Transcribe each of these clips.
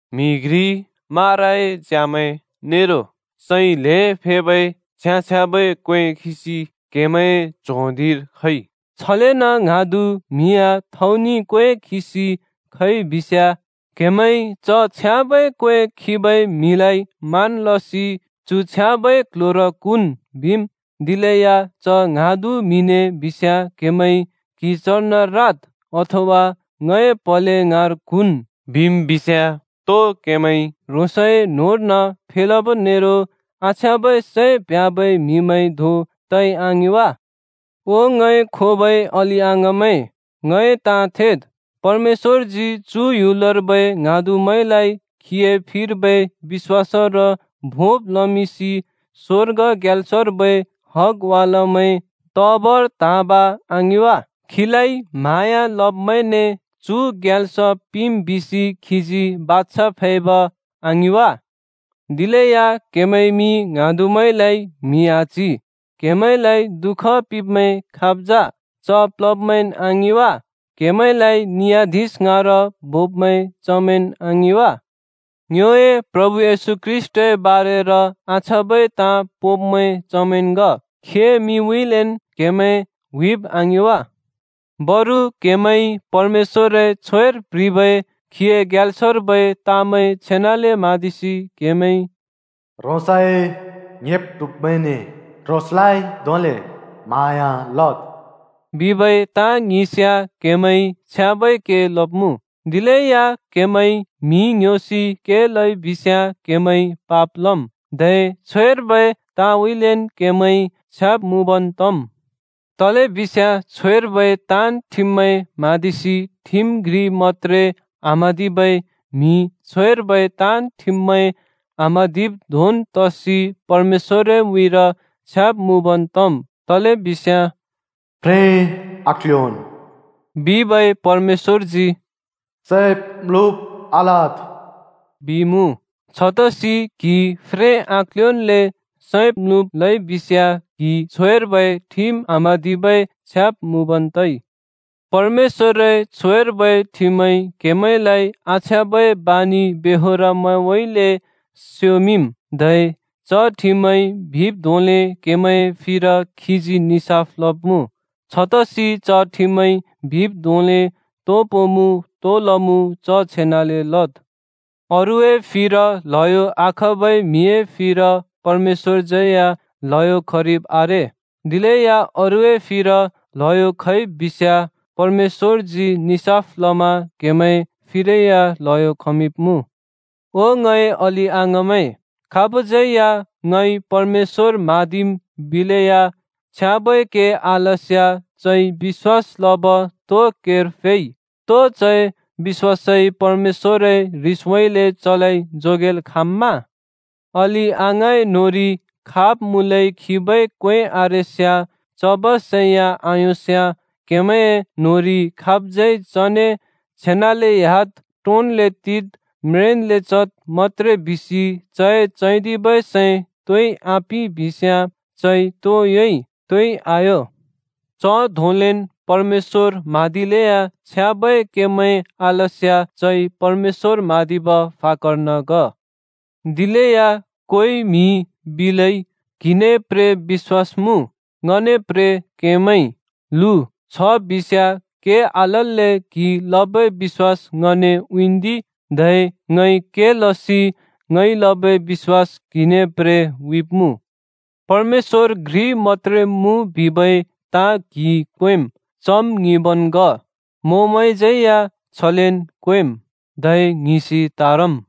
म्‍हि घ्रि माराए च्यामैं नेरो सै ल्हें फेबै छ्याँ-छ्याँबै क्‍वें खिसि क्‍हेमैंए च्हों धिंर खइ, छलेन ङ्हाँदु म्हि या थौनि क्‍वें खिसि खइ बिस्याँ, क्‍हेमैंइ च छ्याँबै क्वें खिबै म्हिलाइ मान लसि “चु छ्याँबै क्‍ल्‍ह्‍योर क्हुँन्” बिम्, दिलेया च ङ्हाँदु म्‍हिने बिस्याँ क्‍हेमैंइ “क्हि चर्न राद्,” अथवा “ङए प्‍हले ङाँर क्हुँन्,” बिम् बिस्याँ, तो क्हेमैंइ ह्रोंसए न्‍होंर्न फेलब नेरो आछ्याँबै सैं प्ह्‍याबै म्हिमैं धों तइ आङिं वा? ओ ङए खोबै अलि-अङाँमैं, ङए ताँ थेद्, परमेश्‍वरजी चु ह्‍युलर्बै ङ्हाँदुमैंलाइ खीए फिर्बै बिश्‍वासर भोंब् लमिंसि स्वर्ग ग्याल्सर्बै हगवालमैं तबर त्हाँब, आङिं वा? खीलाइ म्हाँया लब्‍मैंने चु ग्याल्स पिंम् बिसि खीजी बाछा फैब, आङिं वा? दिलेया क्‍हेमैंइ मि ङ्हाँदुमैंलाइ म्हि आच्हि। क्‍हेमैंलाइ दुःख पिंब्मैं खाब् जा? च प्लब्‍मैंन् आङिं वा? क्‍हेमैंलाइ नियाधिश ङाँर बोब्मैं चमैंन् आङिं वा? ङ्योए प्रभु येशू ख्रीष्‍टए बारेर आछ्याँबै ताँ पोंब्मैं चमैंन् ग। खीए मिंउँइँलेन् क्हेमैं हुइब् आङिं वा? बरु क्‍हेमैंइ परमेश्‍वरए छ्वेर प्ह्रिबै खीए ग्याल्सर्बै ताँमैं छेनाले म्हाँदिसि क्हेमैंइ “ह्रोंसए ङ्‍हेब् ट्हुब्मैंने ह्रोंसलाइन धोंले म्हाँया लद्!” बिबै ताँ ङिंस्याँ क्हेमैंइ छ्याँबै के लब्मुँ। दिलेया क्‍हेमैंइ म्‍हि ङ्ह्‍योसि के लइ बिस्‍याँ क्हेमैंइ पाप लम्, धै छ्वेर्बै ताँउँइँलेन् क्हेमैं छ्याब् मुँबन् तम्। तलेबिस्याँ छ्वेर्बै ताँन् ठिममैं म्हाँदिसि ठिम घ्रि मत्‍त्रे आम्हाँदिबै म्हिइ छ्वेर्बै ताँन् ठिममैं आम्हाँदिब् धोंन् तसि परमेश्‍वरए उँइँर छ्याब् मुँबन् तम्। तलेबिस्याँ “फ्रें आक्ल्योंन्” बिबै परमेश्‍वरजी “सैब्-म्‍लुब् या आलद्” बिइमुँ। छतसि क्‍हिइ फ्रें आक्ल्योंन्ले सैब्-म्‍लुब् लइबिस्‍याँ क्हि छ्वेर्बै ठिम आम्हाँदिबै छ्याब् मुँबन् तइ। परमेश्‍वरए छ्वेर्बै ठिमइ क्हेमैंलाइ आछ्याँबै बानि-बेहोरमैंउँइँले स्योमिंम्, धै च ठिमइ बिब् धोंले क्‍हेमैंए फिर खीजी निसाफ लब्‍मुँ। छतसि च ठिमइ बिब् धोंले तो पोंमुँ तो लमुँ च छेनाले लद्। अरूए फिर ल्हयो आखबै म्‍हिए फिर परमेश्‍वरज्यै या ल्हयो खरिब् आरे। दिलेया अरूए फिर ल्हयो खइ बिस्‍याँ, परमेश्‍वरजी निसाफ लमा क्‍हेमैं फिरै या ल्हयो खमिंब्‍मुँ। ओ ङए अलि-अङाँमैं, खाबज्‍यै या “ङइ परमेश्‍वर म्हाँदिम्” बिलेया, छ्याँबै के आलस्‍याँ चइ बिश्‍वास लब तो केर फेइ? तो चए बिश्‍वासइ परमेश्‍वरए ह्रिसउँइँले चलाइ जोगेल् खाँम्‍मा? अलि-अङाँए न्होंरि खाब् मुँलै खिबै क्वें आरेस्याँ, चब सै या आयोंस्‍याँ, क्‍हेमैंए न्होंरि खाबज्यै चने “छेनाले ह्‍याद्, टोंन्ले टिद्, म्रेंन्ले चद्” मत्‍त्रे बिसि चए चैदिबै सै तोइ आपिंइ बिस्‍याँ, चइ तो योंइ? तोइ आयों। च धोंलेन् परमेश्‍वर म्हाँदिलेया छ्याँबै केमैं आलस्‍याँ चइ परमेश्‍वर म्हाँदिब फाकर्न ग। दिलेया कोइ म्‍हिइ बिलै, “क्हिने प्रे बिश्‍वास मुँ, ङने प्रे केमैं। ल्हु, छबिस्याँ के आलल्‍ले क्‍हिइ लबै बिश्‍वास ङने उँइँन्दि! धै ङइ के लसि ङइ लबै बिश्‍वास क्‍हिने प्रे उँइँब्मुँ।” परमेश्‍वर घ्रि मत्‍त्रे मुँ बिबै ताँ क्‍हिइ क्वेंम्, चम् ङिंबन् ग! मोंमैंज्यै या छलेन् क्वेंम्, धै ङ्हिंसि त्‍हारम्।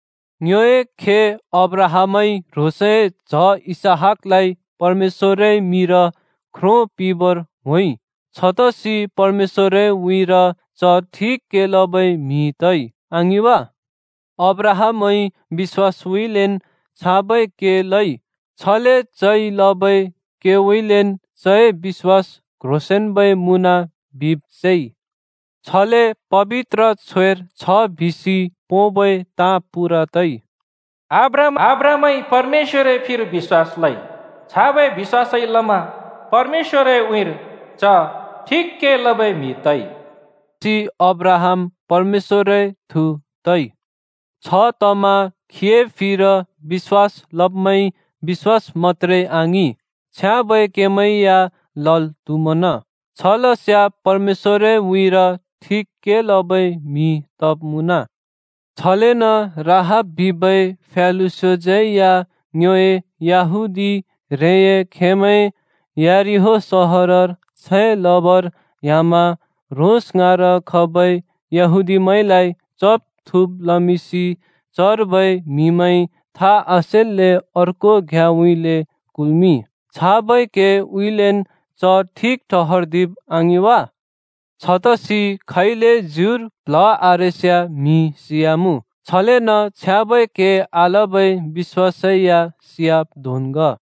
ङ्योए खे अब्राहामइ ह्रोंसए च्‍ह इसहाकलाइ परमेश्‍वरए मिंर ख्रो पिंबर होंइ। छतसि परमेश्‍वरए उँइँर च ठिक के लबै म्हि तइ, आङिं वा? अब्राहामइ बिश्‍वासउँइँलेन् छाबै के लइ। छले चइ लबै केउँइँलेन् चए बिश्‍वास क्ह्रोंसेंन्बै मुँन बिब् सेइ। छले पबित्र छ्वेर छ बिसि पोंबै ताँ पूरा तइ: “अब्राहामइ परमेश्‍वरए फिर बिश्‍वास लइ, छाबै बिश्‍वासइ लमा परमेश्‍वरए उँइँर च ठिक के लबै म्हि तइ।” छतसि अब्राहाम “परमेश्‍वरए थु,” तइ। छतमा खीए फिर बिश्‍वास लब्मैंइ बिश्‍वास मत्‍त्रे आङिं, छ्याँबै केमैं या लल् त्हुमन। छलस्याँ परमेश्‍वरए उँइँर ठिक के लबै म्हिमैं तब् मुँन। छलेन राहाब बिबै फ्यालुस्योज्‍यै या ङ्योए यहूदी ह्रेंए खेमैं यरिहो सहरर छैं लबर ह्‍यामा ह्रोंस ङाँर खबै यहूदीमैंलाइ चब् थुँब् लमिंसि चर्बै म्हिमैंइ था आसेल्‍ले अर्को घ्‍याँउँइँले कुल्मिंइ। छाबै केउँइँलेन् च ठिक ठहर्दिब आङिं वा? छतसि खैले ज्युर प्‍ल्‍ह आरेस्‍याँ म्हि सियामुँ, छलेन छ्याँबै के आलबै बिश्‍वासै या सियाब् धोंन् ग।